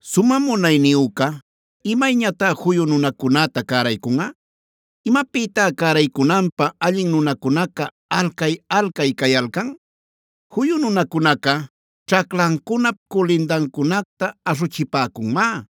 “Sumä Munayniyüca, ¿imayñatá juyu nunacunäta cäraycunꞌa? ¿Imapïtá cäraycunanpä allin nunacunaca alcay-alcay cayalcan? Juyu nunacunaca ćhaclancunap culindancunacta aśhuchipäcunmá;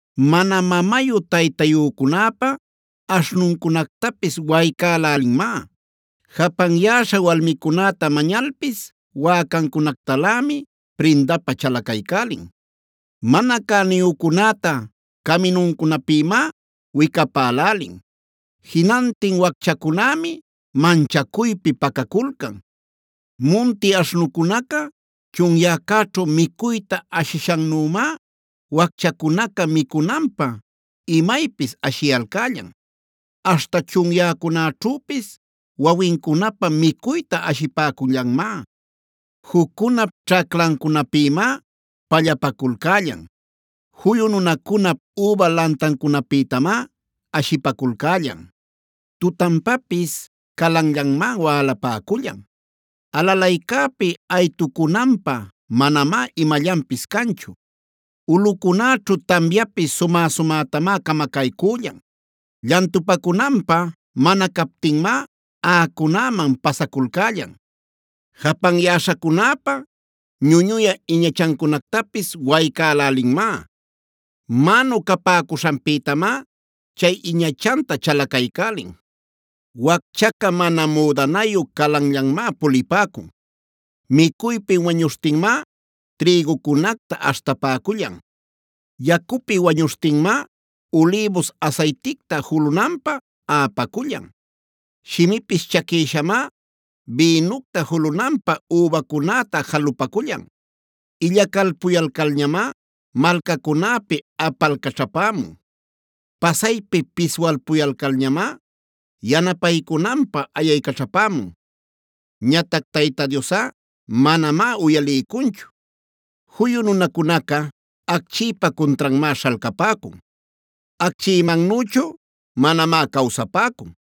Mana mamayu-taytayücunäpa aśhnuncunactapis waycälälinmá; japanyäśha walmicunäta mañalpis wäcancunactalämi prindapä chalacaycälin. Mana cäniyücunäta caminuncunapïmá wicapälälin; jinantin wacchacunämi manchacuypi pacaculcan. Munti aśhnucunaca chunyäcäćhu micuyta ashishannümá, wacchacunaca micunanpä imaypis ashiyalcällan; aśhta chunyäcunäćhüpis wawincunapä micuyta ashipäcullanmá. Juccunap ćhaclancunapïmá pallapaculcällan; juyu nunacunap üba lantancunapïtamá ashipaculcällan. Tutanpapis calanllanmá wälapäcullan; alalaycäpi aytucunanpä manamá imallanpis canchu. Ulꞌucunäćhu tamyapis sumä-sumätamá camacaycüllan; llantupacunanpä mana captinmá aꞌacunäman pasaculcällan. “Japanyäśhacunäpa ñuñuyä iñachancunactapis waycälälinmá; mänu capäcuśhanpïtamá chay iñachanta chalacaycälin. Wacchaca mana müdanayu calanllanmá pulipäcun; micuypi wañuśhtinmá trïgucunacta aśhtapacullan. Yacupi wañuśhtinmá ulïbus asayticta julunanpä aꞌapacullan; shimipis chaquïshamá bïnucta julunanpä übacunäta jalupacullan. Illacalpuyalcalñamá malcacunäpi apalcaćhapämun. Pasaypi piswalpuyalcalñamá yanapaycunanpä ayaycaćhapämun. Ñatac Tayta Diosꞌa manamá uyaliycunchu. “Juyu nunacunaca, acchïpa cuntranmá śhalcapäcun. Acchïmannüchu manamá cawsapäcun;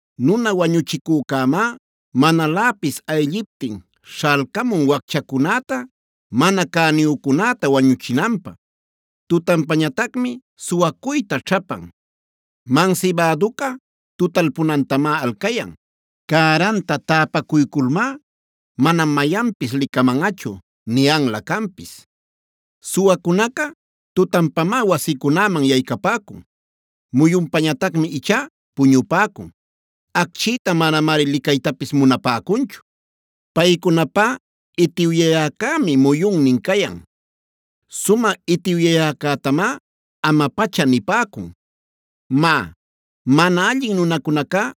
Nuna wañuchicücämá manaläpis aylliptin śhalcamun wacchacunäta, mana cäniyücunäta wañuchinanpä; tutanpañatacmi suwacuyta ćhapan. Mansibäduca tutalpunantamá alcayan; cäranta täpacuyculmá: ‘Manam mayanpis licamanꞌachu’ niyanlä canpis. Suwacunaca tutanpamá wasicunäman yaycapäcun; muyunpañatacmi ichá puñupäcun. Acchïta manamari licaytapis munapäcunchu. Paycunapá itiwyayäcämi muyunnin cayan; sumä itiwyayäcätamá ama-pacha nipäcun. “Má, mana allin nunacunacá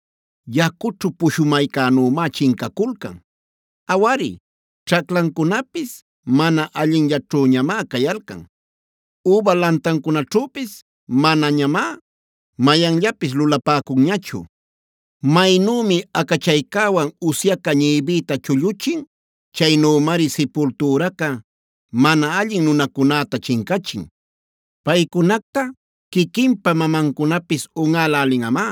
yacućhu pushumaycänümá chincaculcan; awari, ćhaclancunapis mana allinllaćhüñamá cayalcan. Üba lantancunaćhüpis manañamá mayanllapis lulapäcunñachu. Maynümi acachaycäwan usyaca ñïbïta chulluchin; chaynümari sipultüraca mana allin nunacunäta chincachin. Paycunacta quiquinpa mamancunapis unꞌälälinꞌamá.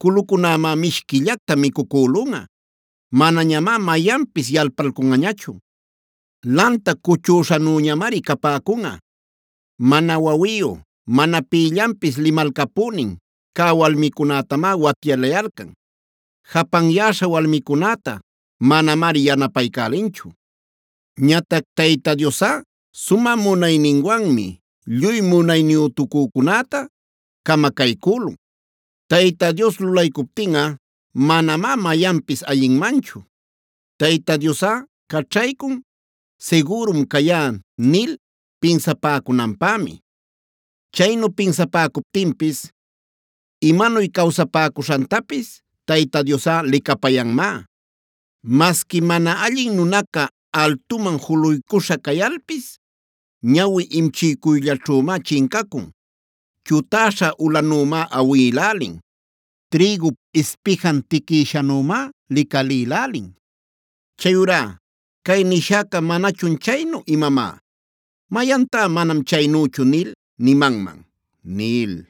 Culucunämá mishquillacta micucülunꞌa; manañamá mayanpis yalpalcunꞌañachu. Lanta cuchüśhanüñamari capäcunꞌa. “Mana wawiyu, mana pïllanpis limalcapünin cä walmicunätamá watyalayalcan;c japanyäśha walmicunäta manamari yanapaycälinchu. Ñatac Tayta Diosꞌa sumä munayninwanmi lluy munayniyütucücunäta camacaycülun. Tayta Dios lulaycuptinꞌa manamá mayanpis ayinmanchu. Tayta Diosꞌa caćhaycun: ‘Sigürum cayá’ nil pinsapäcunanpämi. Chaynu pinsapäcuptinpis imanuy cawsapäcuśhantapis Tayta Diosꞌa licapayanmá. Masqui mana allin nunaca altuman juluycuśha cayalpis, ñawi imchiycuyllaćhümá chincacun; chutäśha ulanümá awïlälin; trïgup ispijan tiquïshanümá licalïlälin. “Chayurá ¿Cay nishäca manachun chaynu imamá? ¿Mayantá ‘manam chaynüchu’ nil nimanman?” nil.